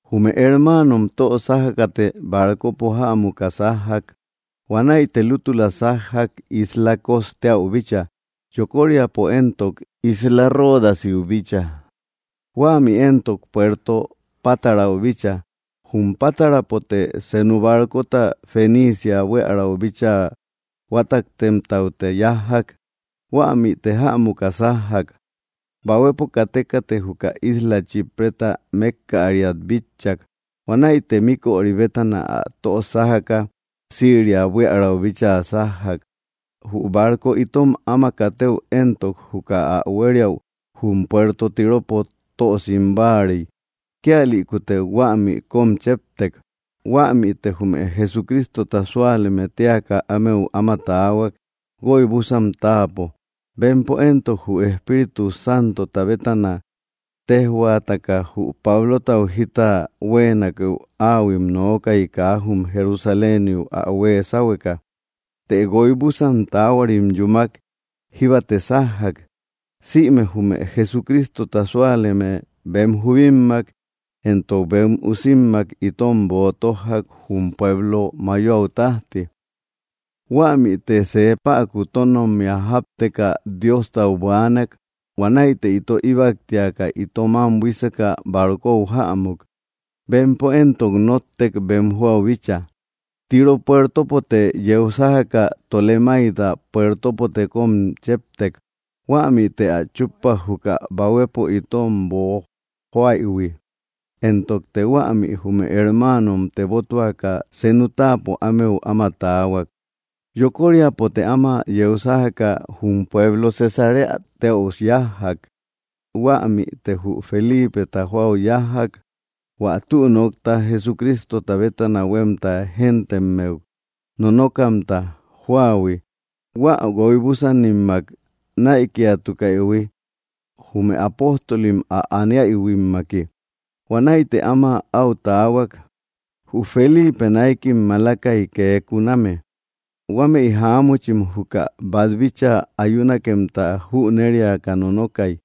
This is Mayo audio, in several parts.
Jume hermaanom tö sájakate barcopo jämuka sájjak. Huanäite lútula sájjak isla Cos teäu bícha, yokóriapo éntok, isla Ródasiu bícha, huämi éntok, puerto Pátarau bícha. Jum Pátarapote senu barcota Feniicia buiärau bíchaa huátaktemtaute yájjak. Huämite jämuka sájjak. Bahuepo katékate juka isla Chípreta mékkäriat bitchak, huanäite míköri bétana ä tösájaka Siria buiärau bíchaa sájjak. Jü barco itom áma katëu éntok, juka ä huériäu jum puerto Tíropo tösim báarei, kíalïkute huämi kom chéptek. Huämite jume Jesucrístota súaleme téaka ámeu áma taahuak guoibusan táapo. Bempo éntok, jü Espíritu Santota bétana téjhuaataka jü Pablotau jita huéenakehu, áahuim nookai kaa jum Jerusaléniu ä huee sáhueka. Të guoibusan taáhuarim yúmak, jíbate sájjak. Sïme jume Jesucrístota súaleme bem jubímmak éntok bem usímmak itom boo tójjak jum pueblo mayoau tajti. Huämite see päku tónommia jápteka Diostau buaanak. Huanäite ito íbaktiaka ito mam buíseka barcou jämuk. Bempo éntok, nóttek bem joau bícha. Tiró puertopote yeu sájaka Tolemáida puertopote kom chéptek. Huämite ä chúppak juka bahuepo itom boojoaïhui. Éntokte huämi jume hermáanom tebótuaka senu táapo ámeu áma taahuak. Yokóriapote áma yeu sájaka jum pueblo Cesaréa téäu yájjak. Huämite jü Felípeta joau yájjak, hua tü nokta Jesucrístota bétana huemta géntemmeu nonókamta jóahui hua guoibúsanimmak näikiatukaïhui, jume apóstolim ä aniaihuimmaki. Huanäite áma au taahuak. Jü Felipe náikim malakai kee kuname. Huámëi jaámuchim juka bat bíchaa ayúnakemta jünériaka nonokai.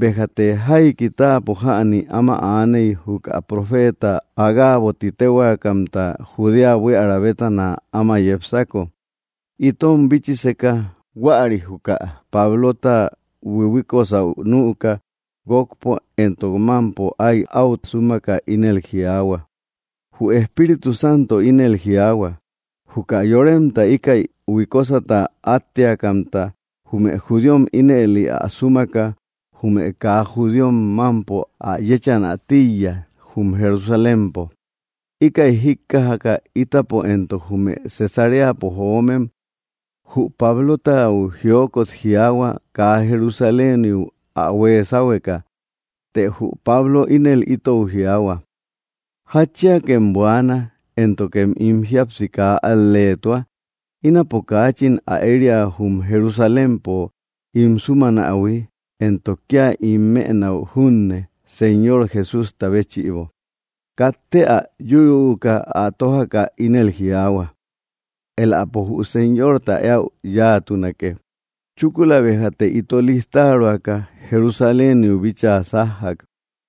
Béjate jaiki táapo jäni áma aaney juka profeta Agabo ti téhuakamta Judea buiära bétana áma yepsako, itom bíchiseka. Huäri juka Pablota huihuíkosäu nüka, guokpo éntok mampo ái au súmaka, ínel jiaahua: —Jü Espíritu Santo ínel jiaahua: “Juka yoremta íkäi huikósata átteakamta jume judíom ínëli ä súmaka jume kaa judíom mampo ä yéchanä tíiya jum Jerusalémpo.” Íkäi jíkkajaka, ítapo éntok jume Cesaréapo joómem jü Pablotau jiókot jiaahua kaa Jerusaléniu ä huee sáhueka. Të jü Pablo ínëli itou jiaahua: —¿Jatchíakem buaana, éntokem ín jíapsi kaa al‑léetua? Ínapo kaachin ä eria jum Jerusalémpo ín sumanähui, éntok kia ín mënäu junne Señor Jesústa béchïbo. Katte ä yúyüuka, ä tójaka ínel jiaahua: —Éläpo jü Señorta éäu yáatunake. Chúkula béjate ito lijtaroaka, Jerusaléniu bíchaa sájjak.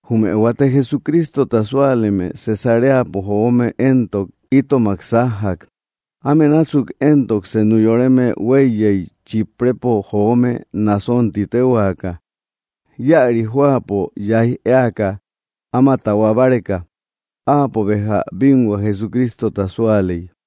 Jume huate Jersucrístota súaleme Cesaréapo joome éntok, itomak sájjak. Áme násuk éntok, senu yoreme hueiyei Chíprepo joome Nason ti téhuaka, íäri jóapo yaij éaka áma tahuá báreka. Áapo béja bínhua Jesucristota súaley.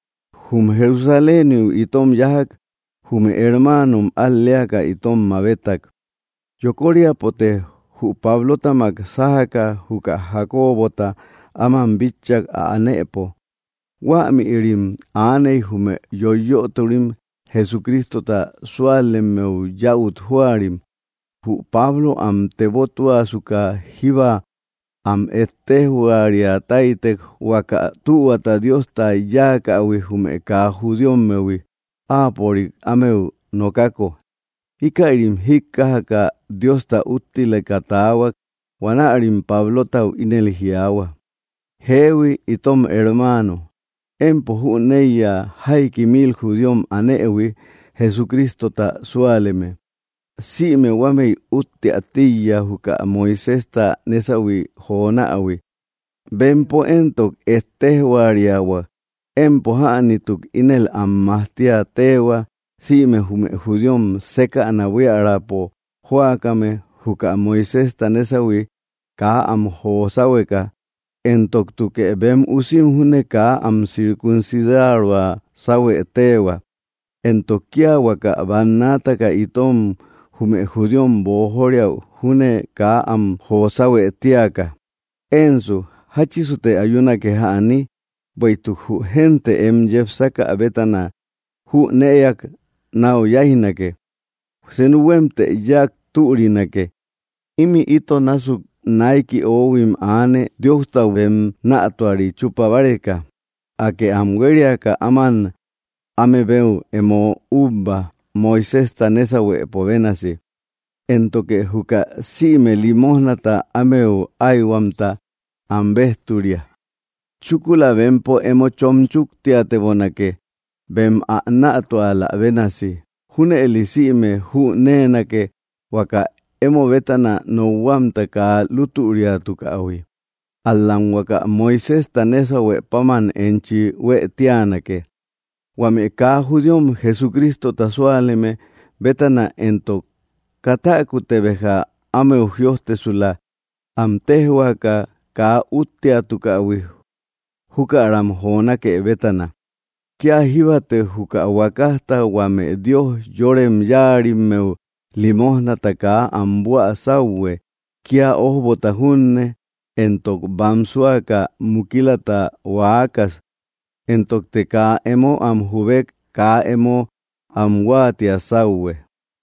Jum Jerusaléniu itom yájak, jume hermáanom al‑léaka itom mabétak. Yokóriapote jü Pablótamak sájaka juka Jakóbota áman bitchak ä anëpo. Huämïrim aaney jume yoiyötori Jesucrístota súalemmeu yäut jóarim. Jü Pablo am tebótuasuka jíba am ettéjhuariatáitek huaka tühuata Diosta yáakähui jume kaa judíommehui áapörik ámeu nokako íkärim jíkkajaka Diosta úttileka taahuak. Huanärim Pablotau ínel jiaahua: —Jéehui, itom hermáano, empo jüneiya jaiki mil judíom anëhui Jesucrístota súaleme. Sïme huámëi útteä tíiya juka Moiséjta nésauhui jonähui. Bempo éntok, ettéjoriahuak empo jänituk ínel am majtíä téehua sïme jume judíom sékäna buíaräpo jóakame juka Moiséjta nésauhui kaa am jo sáuheka, éntoktukë bem usim júne kaa am circuncidaroa sáuhuë téehua, éntok kia huaka bannaataka itom, jume judíom, boojóriäu júne kaa am jo sáuhuë téaka. Ensu, ¿jáchisute ayúnake jäni? Bueïtuk jü génte em yepsákä bétana jünëak nau yáijnake. Senu huémtë yáak türinake. Imi ito násuk naiki oóhuim aane Diostau bem nätuari chupa báreka. Akë am huériaka áman áme beu emo ubba Moiséjta nésauhuëpo bénasi, éntoke juka sïme limójnata ámeu aïhuamta am béjturia. Chúkula bempo emo chon chúktiatebonake bem ä nätualä bénasi. Júnëli sïme jünéenake huaka emo bétana nokhuamta kaa lútüriatukähui. Ál‑lam huaka Moiséjta nésauhuë páman enchi huëtíanake. Huame kaa judíom Jesucrístota súaleme bétana éntok, katäkute béja ámeu jïojtesula am téjhuaaka kaa útteatukähui jukaram jonákë bétana. Kia jíbate juka huakajta huame dios yorem yáarimmeu limójnata kaa am buä sáuhue, kia ojbota junne, éntok bámsuaka mukílata huaakas. Éntokte kaa emo am jubek kaa emo am huáatia sáuhue.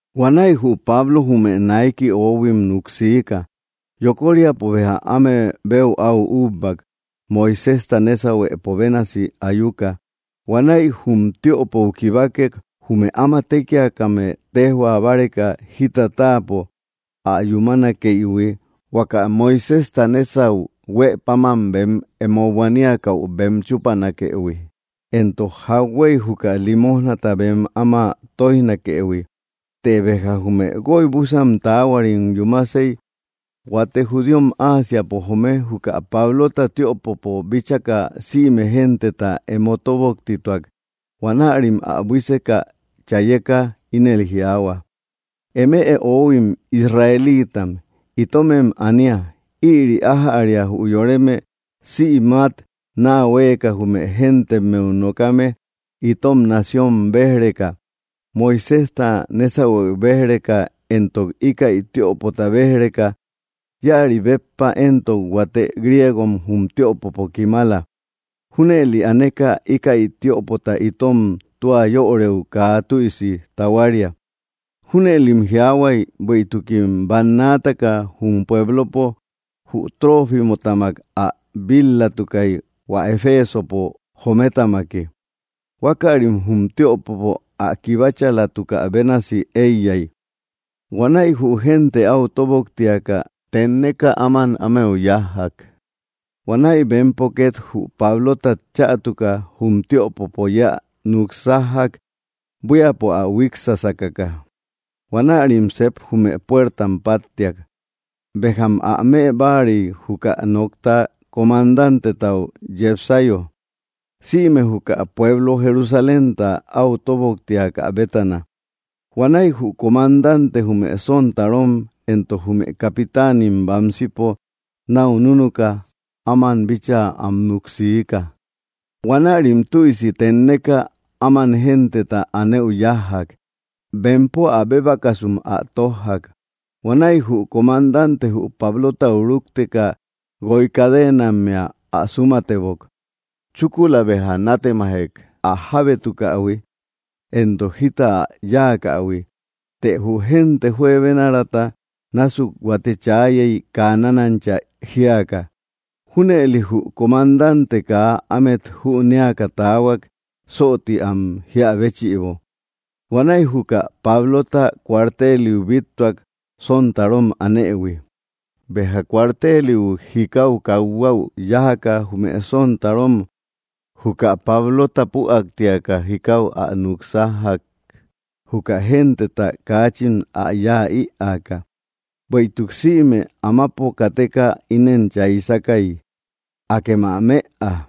Huanäi jü Pablo jume naiki oóhuim nuksiika. Yokóriapo béja áme beu au úbbak Moiséjta nésauhuëpo bénasi ayuka. Huanäi jum tiöpou kibákek jume áma tékiakame téjhua báreka jita táapo ä yumánakeïhui huaka Moiséjta nesau huë páman bem emo buaníakäu bem chúpanakëhui, éntok jakhüéi juka límojnata bem áma tóijnakëhui. Të béja jume guoibusan taáhuarim yúmasei, huate judíom Ásiapo joome juka Pablota tiöpopo bíchaka, sïme genteta emo tóboktituak. Huanärim ä buíseka, chayeka ínel jiaahua: —¡Eme oóhuim Israelítam, itómem anía! Ïri ájäria jü yoreme sïmat naa huéeka jume géntemmeu nokame itom nación béj‑reka, Moiséjta nésauhuëu béj‑reka, éntok íkäi tiöpota béj‑reka. Íäri béppa éntok, huate griégom jum tiöpopo kimala. Júnëli aneka íkäi tiöpota itom tua yöreu kaa tüisi tahuária. Júnëlim jiaahuay bueïtukim bannaataka jum puéblopo jü Trófimotamak ä bil-latukay, hua Efesopo joometamaki. Huákärim jum tiöpopo ä kibáchalatukä bénasi éiyay. Huanäi jü génte au tóboktiaka, tenneka áman ámeu yájjak. Huanäi bempo ket jü Pablótat chätuka jum tiöpopo yeä nuksájjak buíapo ä huíksakaka. Huanärim sep jume puértam páttiak. Béjam ä më báarei juka nokta comandantetau yepsayo sïme juka pueblo Jerusalémta au tóboktiakä bétana. Huanäi jü comandante jume sontarom éntok jume capitáanim bamsipo nau núnuka áman bíchaa am nuksiika. Huanärim tüisi teénneka áman genteta anëu yájjak. Bempo ä bébakasum ä tójjak. Huanäi jü comandante jü Pablotau rúkteka guoi cadenammea ä súmatebok. Chúkula béja nátemajek ä jábétukähui éntok jita ä yáakähui. Të jü génte juebénarata násuk huate chaayey kaa nanancha jíaka. Júnëli jü comandante kaa ámet jünéaka taahuak sooti am jíä béchïbo. Huanäi juka Pablota cuarteliu bíttuak, sontarom anëhui. Béja cuarteliu jikáu kathuäu yájaka jume sontarom juka Pablota püaktiaka jikau ä núk sájjak, juka genteta káachin ä yáa ïaka. Bueïtuk sïme amapo kateka inen chaisakai: —¡Akem ä mëa!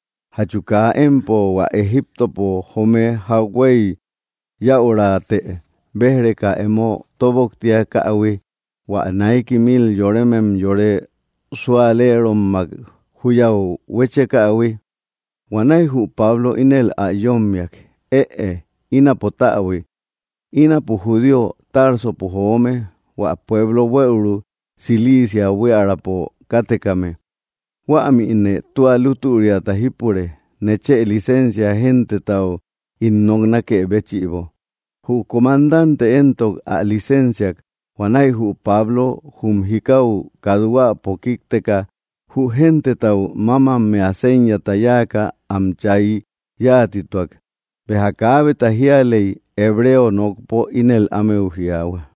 ¿Jatchu kaa empo hua Egíptopo joome jakhuey yäurate béj‑reka emo tóboktiakähui, hua naiki mil yorémem yore sualéeraommak juyau huéchekaïhui? Huanäi jü Pablo ínel ä yómmiak: —Ëe, ínapo täbui. Ínapo judío, Társopo joome, hua pueblo buëuru Cilicia buíaräpo kátekame. Huämine tua lútüriata jípure. Nechë lisensia gentetau ín noknákë béchïbo. Jü comandante éntok, ä lisensiak. Huanäi jü Pablo jum jikau kathuäpo kíkteka, jü gentetau mámammea séñata yáaka am chay yáatituak. Béja kaábeta jíalei, hebreo nokpo ínel ámeu jiaahua: